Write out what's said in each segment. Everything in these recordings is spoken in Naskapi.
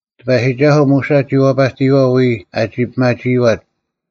ᑎᐸᔨᒋᒐᓱᐤ ᒧᓴ ᒋ ᐛᐸᑎᔨᐛᐤ ᐎᔾ ᐊᒋ ᐱᒪᒋᐃᐛᑦ;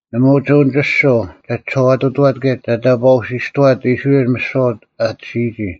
ᓇᒪ ᐅᒋ ᐅᓂᒋᔅᒍᐤ ᒐ ᒋᓴᐛᑐᑐᐛᑦ ᑭᔭ ᒐ ᑕᑈᐅᓯᔅᑐᐛᑦ ᐃᔅᕋᐃᓚ ᒥᓯᐛ ᐊᑎᓯᔨᒋ;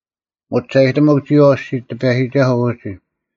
ᒧᒋᒐᔨᑎᒧᒄ ᒋᔨᐛᐤ ᐊᔅᒋᒡ ᑎᐸᔨᒋᒐᓱᐤ ᐅᒋ;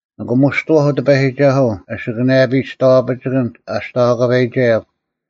ᓂᑭᒧᔅᑐᐛᐧᒄ ᑎᐸᔨᒋᒐᓱᐤ ᐊᓯᑭᓇᔭᐱᔾ ᒋᔍᐛᐱᒋᑭᓐ ᐊ ᒋᔍᐛᑲᐸᐃᒐᔭᒄ;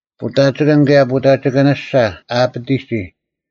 ᐳᑕᒋᑭᓐ ᑭᔭ ᐸᑕᒋᑭᓂᔅᒐ ᐊ ᐊᐱᑎᔨᒋ,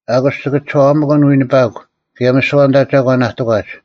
ᐊᑯᔅ ᒋᑭ ᒋᔄᐛᒪᑭᓐ ᐎᓂᐸᒄ, ᑭᔭ ᒥᓯᐛ ᐊᓐᑕ ᒐᒂᓐ ᐊ ᑎᒂᒡ;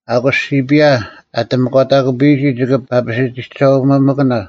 ᐊᑯᔅ ᓯᐱᔭ ᐊ ᑎᒥᒂᑕᑯᐱᔨᒋ ᒋᑭ ᐱᐸᓯᑎᒐᐅᒥᑭᓇ,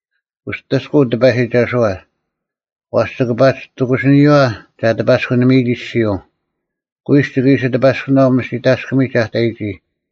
ᐅᑎᔅᑯᐤ ᑎᐸᔨᒋᒐᓱᐛ; ᐛᔅ ᒋᑭ ᐸᒋ ᑎᑯᓯᓂᔪᐛ ᒐ ᑎᐸᔅᑯᓂᒥᔨᒋ ᐊᔅᒋᔪᐤ: ᑯᐃᔅᒄ ᒋᑭ ᐃᓯ ᑎᐸᔅᑯᓇᐤ ᒥᓯᑕᔅᑭᒥᒡ ᐊ ᑕᔨᒋ,